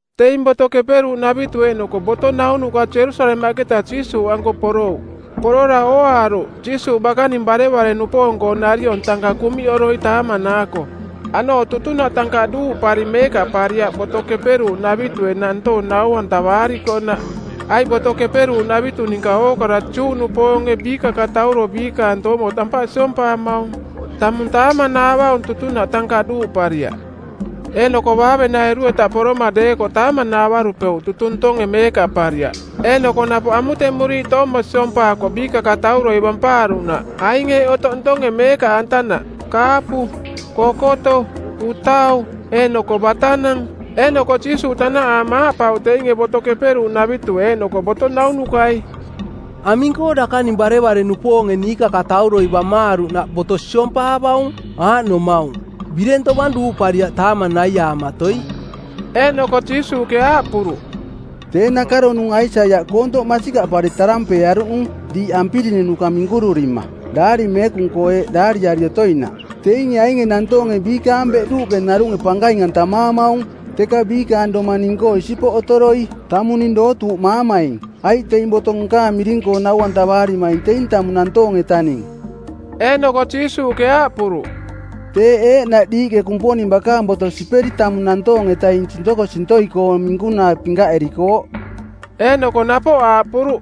Teing Boto Keperuuꞌnavitu eeꞌnoko boto naunuka Jerusalemaꞌketa Jiisuuꞌanko porouꞌ. Porora ooaaruꞌ Jiisuuꞌ bakaning barevare-nupoong-koo nariong tankaꞌ kuꞌmiꞌoroi taamanaako. Aꞌnooꞌ tutunaꞌ tankaꞌ duuꞌpari meekaꞌpariaꞌ Boto Keperuuꞌnavitue nantoong nau-antavaarikoꞌnaꞌ. Aiꞌ Boto Keperuuꞌnavitu ninka ookara Juꞌnupoonge biikakatauro biikaang toomo tampaꞌ siompaamaung. Tamung taamanaavaung tutunaꞌ tankaꞌ duuꞌpariaꞌ. Eeꞌnoko baavenairu-eta poroma deekoꞌ taamanaavarupeuꞌ tutung ntonge meekaꞌpariaꞌ eeꞌnoko napoꞌ amutemuriiꞌ toomo siompaakooꞌ biikakatauroi bampaaruꞌnaꞌ aing eeꞌ otoꞌ ntonge meekaꞌantanaꞌ: kaapu, kokoto, utau, eeꞌnoko batanang. Eeꞌnoko Jiisuuꞌ tanaꞌaama aaꞌpauꞌ teinge Boto Keperuuꞌnavitue eeꞌnoko boto naunukai, “Aming-koo dakaning barevare-nupoonge niikakatauroi bamaaruꞌnaꞌ boto siompaavaung, aaꞌnomaung, bireng tovang duuꞌpariaꞌ taamang naiaamatoi?” Eeꞌnoko Jiisuuꞌke aaꞌpuruꞌ, “Tee nakaronung Aisaiaꞌ koontoꞌ masikaꞌpari tarampeearuꞌnung˜ diiꞌ ampirinunuka minkururima, Daari Meekung-koo eeꞌ daariari otoinaꞌ, ‘Teinge ainge nantoonge biikaang beꞌduuꞌke narunge pankaing-antamaamaung, teka biikaang domang ning-koo isipoꞌ otoroi. Tamung ning dootuuꞌmaamaing, aiꞌ teing boto nkaang miring-koo nau-antavaarimaing teing tamung nantoong-etaning.’” Eeꞌnoko Jiisuuꞌke aaꞌpuruꞌ, “Teeꞌ eeꞌnaꞌ diiꞌke Kumponing bakaang boto siperi tamung nantoong-etaing sintokosintoi-koong minkunaa pinkaꞌerikooꞌ.” Eeꞌnoko napoꞌ aaꞌpuruꞌ,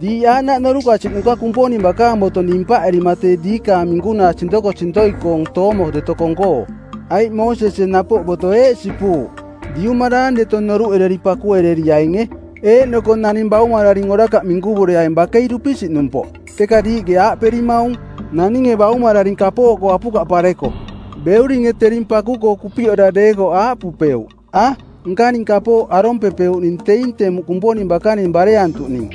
“Diiꞌ aaꞌnaꞌ norukasiꞌnuka Kumponing bakaang boto nimpaꞌerima tee diikaang minkunaa sintokosintoi-koong toomo deto kong-koo. Aiꞌ Moosesie napoꞌ boto eeꞌ sipuuꞌ, ‘Diumaraang deto noruꞌereri pakuereriainge’. Eeꞌnoko ‘Naning baumararing orakaꞌ minkuvureaing bakei dupisiꞌnumpoꞌ.’ Teka diiꞌke aaꞌperimaung, ‘Naninge baumararing kapooꞌkoo apukaꞌpareko, beuringe tering paku-koo kupiꞌora deekoꞌ aaꞌpupeuꞌ, “A, nkaning kapooꞌ arompepeuꞌning teing temuꞌ Kumponing bakaning bareantuꞌning.”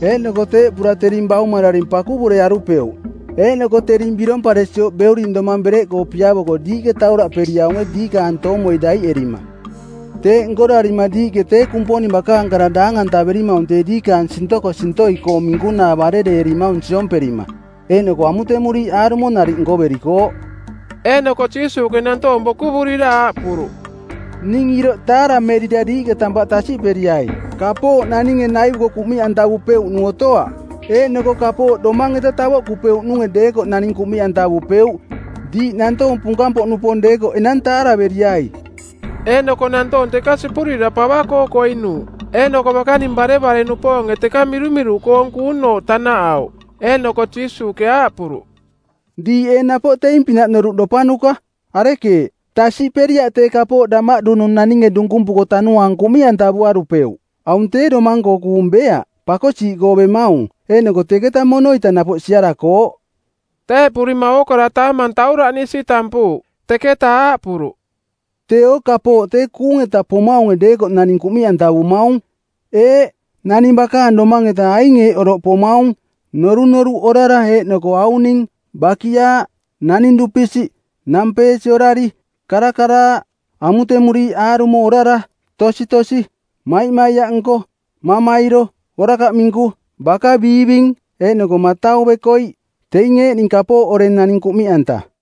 Eeꞌnoko teeꞌpura tering baumararing pakuvurearupeuꞌ.’ Eeꞌnoko tering biromparesioꞌ beuring domang bereꞌkoo piavoko diiꞌke tauraꞌperiaunge diikaang toomoi daiꞌerima. Teeꞌ nkorarima diiꞌke tee Kumponing bakaang kara daang-antaverimaung tee diikaang sintokosintoi-koong minkunaa barereerimaung siomperima, eeꞌnoko amutemuriiꞌ aarumo nariꞌ nkoverikooꞌ.” Eeꞌnoko Jiisuuꞌke nantoong bokuvurira aaꞌpuruꞌ, “Ning iroꞌ taaramerira diiꞌke tampaꞌ tasiꞌperiai. Kapooꞌ naninge naivuko kumiꞌantavupeuꞌnung otoaꞌ. Eeꞌnoko kapooꞌ domaang-eta tavoꞌkupeuꞌnunge deekoꞌ naning kuꞌmiꞌantavupeuꞌ Diiꞌ nantoong punkang-poꞌnupoong deekoꞌ enang taaraveriai!” Eeꞌnoko nantoong teka sipurira pava-koo koinuuꞌ, eeꞌnoko bakaning barevare-nupoonge teka mirumiruꞌkoong kuunooꞌ tanaꞌauꞌ. Eeꞌnoko Jiisuuꞌke aaꞌpuruꞌ, “Diiꞌ ee napoꞌ teing-pinaꞌ noruꞌdopanuka? Arekeeꞌ, tasiꞌperiaꞌ tee kapooꞌ damaꞌdunung naninge dunkumpuko tanuaang kuꞌmiꞌantavuarupeuꞌ? Aung tee domang-koo kuung beaꞌ, pakosiiꞌkoo bemaung, eeꞌnoko teketa mono-ita napoꞌ siarakooꞌ.” Teeꞌpurima ookara taamang tauraꞌnisi tampuuꞌ. Teketa aaꞌpuruꞌ, “Teeo kapooꞌ tee kuung-eta pomaunge deekoꞌ naning kuꞌmiꞌantavumaung. Eeꞌ, naning bakaang domaang-eta aing eeꞌ oroꞌ pomaung: norunoruꞌ orara eeꞌnoko auning, bakiaaꞌ, naning dupisiꞌ, nampeesi orari, karakaraaꞌ, amutemuriiꞌ aarumo orara, tositosi, maimaiaꞌnko, mamairo, orakaꞌ minku, baka biiving, eeꞌnoko matau bekoiꞌ. Teing eeꞌning kapooꞌ oreng naing kuꞌmiꞌanta.”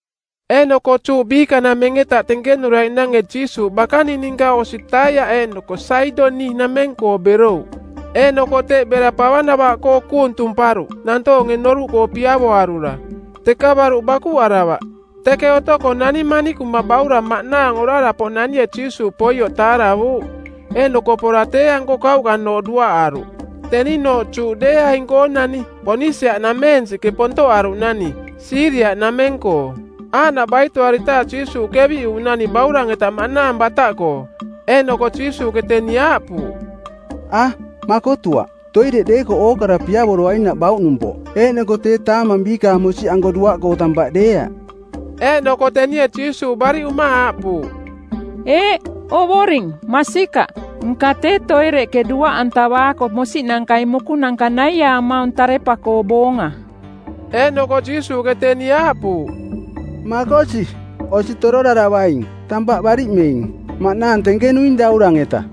Eeꞌnoko Juꞌ biikanameng-eta tenkenuraiꞌnange Jiisuuꞌ bakaning ninka osi Taiaꞌ eeꞌnoko Saidoniꞌnameng-koo berouꞌ. Eeꞌnoko teꞌ bera pava navaꞌkoo kuung tumparuꞌ nantoonge noruꞌkoo piavoarura. Teka baruꞌ bakuꞌaravaꞌ. Teke otoko nani manikuma baurang maꞌnaang orara-poꞌnanie Jiisuuꞌ poioꞌ taaravuuꞌ, eeꞌnoko pora tee-anko kauꞌkanooꞌ duaꞌaruꞌ. Teninooꞌ Juꞌdeeaing-koonani, Ponisia-nameensiꞌke pontoꞌaruꞌnani, Siiria-nameng-koo. Aaꞌnaꞌ baitoaritaaꞌ Jiisuuꞌ keviꞌuuꞌnani baurang-eta maꞌnaang bataꞌkoo. Eeꞌnoko Jiisuuꞌke teni aaꞌpuuꞌ, “A, makotuaꞌ! Toireꞌ deekoꞌ ookara piavoroainaꞌ bauꞌnumpoꞌ, eeꞌnoko tee taamang biikaang mosiꞌnanka-anko duaꞌkoo tampaꞌ deeaꞌ.” Eeꞌnoko tenie Jiisuuꞌ bariꞌuma aaꞌpuuꞌ, “Eeꞌ, Ovoring, masikaꞌ, nka tee toireꞌke duaꞌantavaako mosiꞌnankai mukunanka naiaamaung tarepa-koo boonga.” Eeꞌnoko Jiisuuꞌke teni aaꞌpuuꞌ, “Makosi, osi tororaravaing. Tampaꞌ bariꞌmeing. Maꞌnaang tenkenuing daurang-eta.”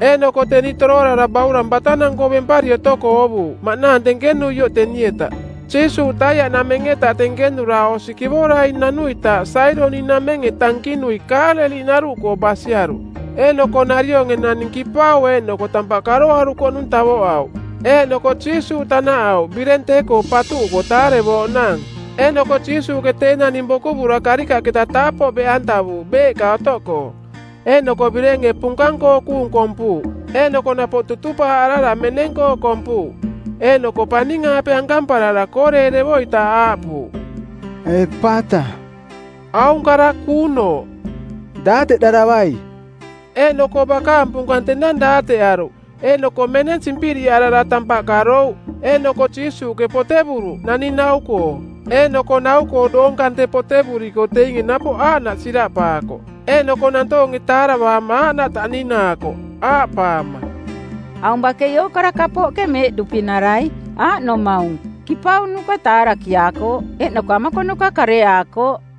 Eeꞌnoko teni toroarara baurang batanang-koo bempari otoko oovuuꞌ maꞌnaang tenkenuioꞌ teni-eta. Jiisuuꞌ Taiaꞌnameng-eta tenkenura osi kivorai nanuitaaꞌ Saidoniꞌnamenge tankinui Kaaleliꞌnaruꞌkoo basiaruꞌ. Eeꞌnoko narionge naning kipau eeꞌnoko tampaꞌ karoarukoꞌnung tavoꞌauꞌ. Eeꞌnoko Jiisuuꞌ tanaꞌauꞌ bireng tee-koo patuꞌuko taarevoaꞌnaang. Eeꞌnoko Jiisuuꞌke tee naning bokuvura karikaꞌketa taapoꞌ beꞌantavuuꞌ beeꞌka otoꞌkoo. Eeꞌnoko birenge punkang-koo kuung kompuuꞌ, eeꞌnoko napoꞌ tutupaaꞌarara meneng-koo kompuuꞌ. Eeꞌnoko paning-aape ankamparara kooreerevoitaaꞌ aaꞌpuuꞌ, “Epata.” Aung kara kuunooꞌ: “Daateꞌdaravai.” Eeꞌnoko bakaang punkang tenang daateꞌaruꞌ eeꞌnoko meneng simpiriꞌarara tampaꞌ karouꞌ. Eeꞌnoko Jiisuuꞌke potevuruꞌ naning nau-koo. Eeꞌnoko nau-koo doong kante potevuriko teinge napoꞌ aaꞌnaꞌ siraꞌpaakoꞌ. Eeꞌnoko nantoonge taaravaama aaꞌnaꞌ taꞌninaakoꞌ aaꞌpaama, “Aung bakei ookara kapooꞌke meeꞌduꞌpinarai, aaꞌnomaung: Kipaunuka taarakiaakooꞌ, eeꞌnoko amakonuka kareaakooꞌ.”